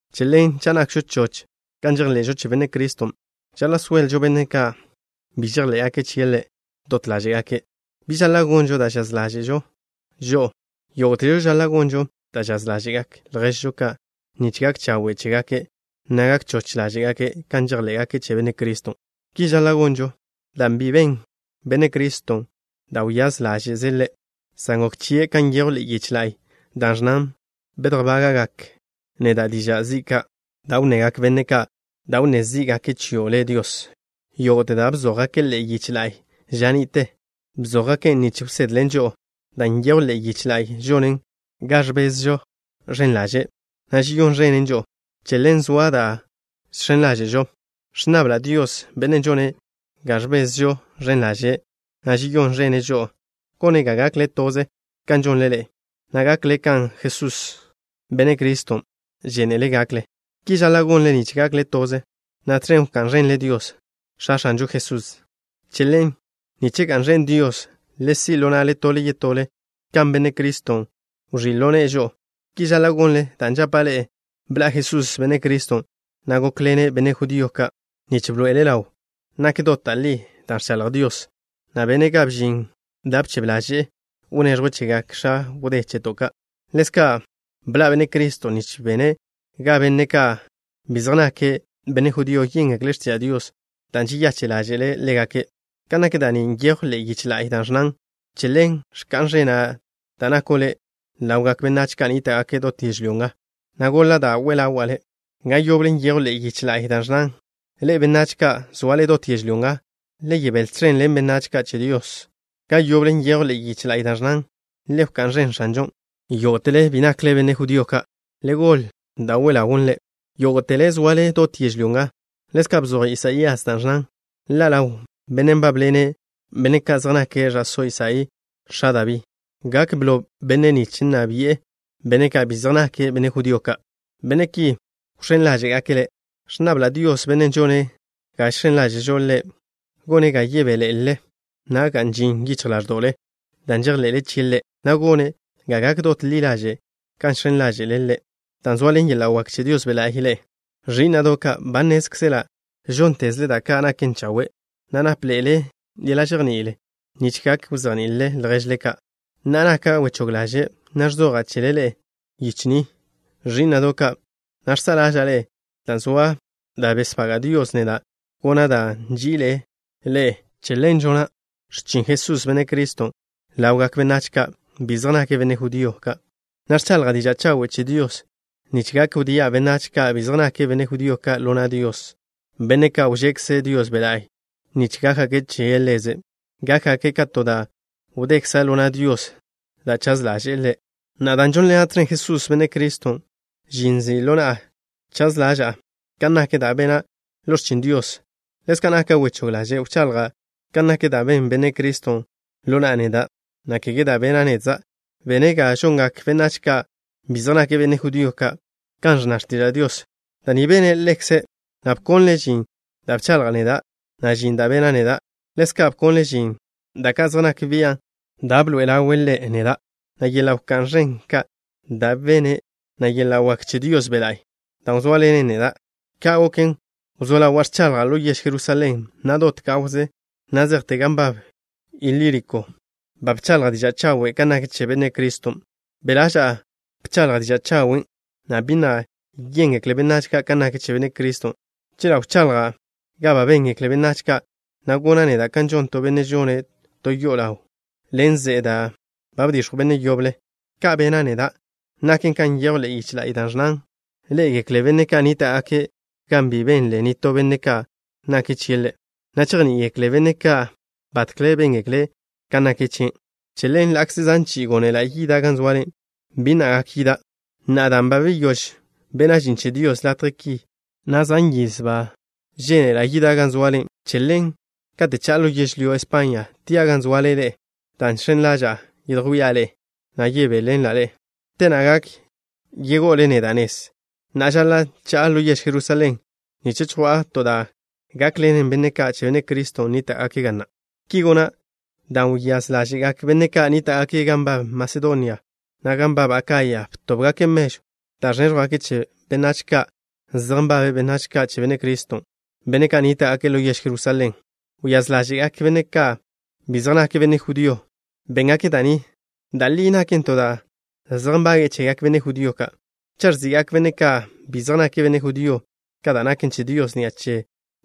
Che ḻen, cha' nakžo choch kan žejḻe'žo che Benne' Criston', žaḻa' soelžo benne' ka' bi žejḻé'gake' chie' Ḻe' dot ḻáže'gake'. Bi žaḻa' gonžo da' žaz ḻáže'zežo žo'o. Yógo'težo žaḻa' gonžo da' žaz ḻáže'gak lježžo ka' nich gak chawe' chégake', na' gak choch ḻáže'gake' kan žejḻé'gake' che Benne' Criston'. Ki žaḻa' gonžo, dan' bi ben Benne' Criston' da' wyáz ḻáže'ze', san gok chie' kan nyejw ḻe'e yiche la'y, da' ẕnnan: “Bedjbága'gak neda' diža' zi' ka' da' wnnegak benne' ka', da' wnné zí'gake' chio' Le', Dios.” Yógo'te da' bzójgake' ḻe'e yiche la'y ža ni'te, bzójgaken' nich wsedlen žo'o. Dan' nyejw ḻe'e yiche la'y žonen ga ẕbezžo ẕen ḻaže', na' žeyón ẕenen žo'o. Che ḻen zoa da' žx̱en ḻáže'žo. Ẕnnabla' Dios, Bennen' žone' ga ẕbezžo ẕen ḻaže', na' žeyón ẕene' žo'o, gone' ga gakle toze kan žonle ḻe'e, na' gakle kan Jesús, Benne' Criston', žénele' gakle. Ki žaḻa' gonle nich gakle toze, na' tẕen wká'n ẕenle Dios, X̱a X̱anžo Jesusen'. Che ḻen, nich ga'n ẕen Dios, le si' ḻo na'le tole yetole kan Benne' Criston' wẕí' ḻo ne'e žo'o. Ki žaḻa' gonle, dan' žapa' ḻe'e: bḻa' Jesús, Benne' Criston', na' gókḻene' benne' judío ka' nich bḻoe'ele' ḻaw nak dot da' li da' ẕchaḻj Dios, na' bene' ga bžin da' bchebe ḻaže'e wneẕjwe' chegak x̱a wdé che'to' ka'. Ḻezka' bḻa' Benne' Criston' nich bene' ga benne' ka' bi zej nake' benne' judío yéngekle' x̱tiža' Dios dan' žeyache' ḻáže'le' ḻégake'. Kan nak da' ni nyejw ḻe'e yiche la'y da' ẕnnan: Che ḻen, wká'n ẕena' da' nako' Le', ḻawgak benách ka' nníta'gake' dot yežlyó nga, na' goḻa' da' we ḻawa' Le'. Ga yoble nyejw ḻe'e yiche la'y da' ẕnnan: Ḻe'e, benách ka' zoale dot yežlyó nga, le yebél tẕen ḻen benách ka' che Dios. Ga yoble nyejw ḻe'e yiche la'y da' ẕnnan: ¡Le wká'n ẕen X̱anžon', yógo'tele bi nakle benne' judío ka'! ¡Le goḻe da' we ḻawn Ḻe', yógo'tele zoale dot yežlyó nga! Ḻezka' bzoj Isaías da' ẕnnan: Ḻa' ḻaw Benne' nbábḻene' benne' ka' zej nake' ẕa'só Isaí, x̱a Dabí. Gak blo Bennen' nich nna bi'e benne' ka' bi zej nake' benne' judío ka'. Benne' ki wx̱én ḻáže'gake' Ḻe'. Ẕnnabla' Dios, Bennen' žone' ga žx̱en ḻáže'žo Ḻe', gone' ga yebéḻe'elele, na' ga'n ži yichj ḻáẕdo'le dan' žejḻe'le chie' Ḻe', na' gone' ga gak dot ḻi ḻaže' kan žx̱en ḻáže'le Ḻe', dan' zoaḻen yeḻa' wak che Dios Be' La'y ḻe'e. Ẕí'na'do' ka', ba nnézkzela' žóntezle da' ka' naken chawe', na' nápḻe'ele yeḻa' žejní'il nich gak wzejní'ilele lježle ka'. Na'a naka' wechóg ḻaže', na' ẕzoja' chele ḻe'e ḻe'e yiche ni, ẕí'na'do' ka', na' žsa'a ḻáže'le dan' zoa da' besbaga' Dios neda' gona' dan' nži'ile' ḻe'e. Che ḻen žona' x̱chin Jesús, Benne' Criston', ḻawgak benách ka' bi zej nake' benne' judío ka', na' ẕchaḻja' diža' chawe' che Dios, nich gak wdía' benách ka' bi zej nake' benne' judío ka' ḻo na' Dios, benne' ka' wžekze Dios Be' La'y nich gákgake' che Ḻeze'. Gákgake' ka to da' wdekza' ḻo na' Dios, da' chaz ḻaže'e Ḻe'. Na'a, dan' žónḻena' tẕen Jesús, Benne' Criston', žin, nzi' ḻo na'a chaz ḻaža'a kan nak da' bena' ḻo x̱chin Dios. Ḻezka' naka' wechóg ḻaže' wchaḻja' kan nak da' ben Benne' Criston' ḻo na'a neda', na' kege da' bena' nedza'. Bene' ga žongak benách ka' bi zej nake' benne' judío ka' kan ẕnna x̱tiža' Dios. Da' ni bene' Ḻekze', na' bkonle' žin da' bchaḻja' neda', na' žin da' bena' neda'. Ḻezka' bkonle' žin da' ka' zej nak bian' da' bḻoe'ele' ḻaw Ḻe' ḻo na'a neda', na' yeḻa' wak ẕen ka' da' bene', na' yeḻa' wak che Dios Be' La'y da' wzóaḻenen neda'. Ka' goken, wzó ḻawa' ẕchaḻja' ḻo yež Jerusalén, na' dot gawze na' zejte gan nbab Ilíriko, ba bchaḻja' diža' chawe' kan nak che Benne' Criston'. Be' ḻaža'a bchaḻja' diža' chawen' gan bi na' yéngekle benách ka' kan nak che Benne' Criston'. Chela' wchaḻja' ga ba béngekle benách ka', na' gona' neda' ka žon to benne' žone' to yo'o ḻaw ḻen ze'e da' ba bdix̱jw benne' yoble. Ka bena' neda' naken kan nyejw ḻe'e yiche la'y, da' ẕnnan: Ḻé'egekle benne' ka' nníta'gake' gan bi benle nitó benne' kan nak chie' Ḻe', na' chejní'igekle benne' ka' batkle béngekle' kan nak chie'. Che ḻen, ḻa'kze zan chi'i gónela' yida' gan zoale, bi na' gak yida'. Na'a, dan' ba beyóž bena' žin che Dios latje ki, na' zan yiz ba žénela' yida' gan zoale, che ḻen, kate' cha'a ḻo yežlyó España, tia' gan zoale ḻe'e, dan' žx̱en ḻaža'a yedjwía' ḻe'e, na' yebéḻenla' ḻe'e. Te na' gak yego'ole neda' nez. Na'a žaḻa' cha'a ḻo yež Jerusalén, nich chjwa'a to da' gákḻenen benne' ka' che Benne' Criston' nníta'gake' ga na'. Ki gona' dan' wyáz ḻáže'gak benne' ka' nníta'gake' gan nbab Masedonia, na' gan nbab Akaya, btóbgake' mežw da' ẕnéẕjwgake' chegak benách yache' ka' zej nbabe' benách ka' che Benne' Criston', benne' ka' nníta'gake' ḻo yež Jerusalén. Wyáz ḻáže'gak benne' ka' bi zej nake' benne' judío ka', béngake' da' ni. Da' li naken to da' zej nbage'e chegak benne' judío ka'. Cha' ẕzi'gak benne' ka' bi zej nake' benne' judío ka' da' naken che Dios ni'a che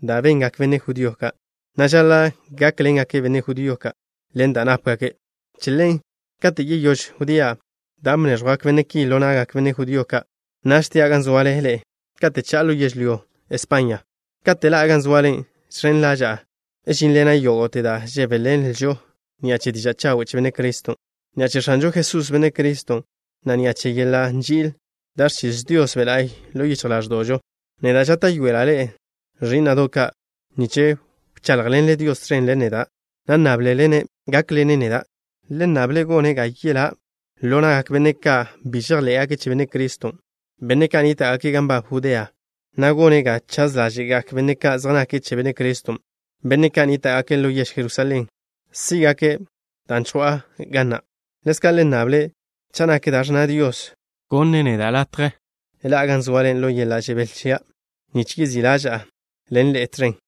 da' bengak benne' judío ka', na' žaḻa' gákḻengake' benne' judío ka' ḻen da' nápgake'. Che ḻen, kate' yeyóž wdía' dan' bnéẕjwgak benne' ki ḻo na'gak benne' judío ka', naž tia' gan zoale ḻe'e kate' cha'a ḻo yežlyó España. Kate' ḻa'a gan zoale, žx̱en ḻaža'a žínḻena' yógo'te da' žebéḻenlžo ni'a che diža' chawe' che Benne' Criston'. Ni'a che X̱anžo Jesús, Benne' Criston', na' ni'a che yeḻa' nži'il da' ẕchiz Dios Be' La'y ḻo yichj ḻáẕdo'žo, neda' žáta'yoela' ḻe'e, ẕí'na'do' ka', nich wcháḻjḻenle Dios tẕen ḻen neda', na' nnáblele-ne' gákḻene' neda'. Le nnable' gone' ga yelá' neda' ḻo na'gak benne' ka' bi žejḻé'gake' che Benne' Criston', benne' ka' nníta'gake' gan nbab Judea, na' gone' ga chaz ḻáže'gak benne' ka' zej nake' che Benne' Criston', benne' ka' nníta'gake' ḻo yež Jerusalén, sí'gake' dan' chjwa'a ga na'. Ḻezka' le nnable', cha' nak da' ẕnna Dios, wneẕjwe' neda' latje ḻa'a gan zoale ḻo yeḻa' žebél chia', nich yezí' ḻáže'ḻena' ḻe'e tẕen.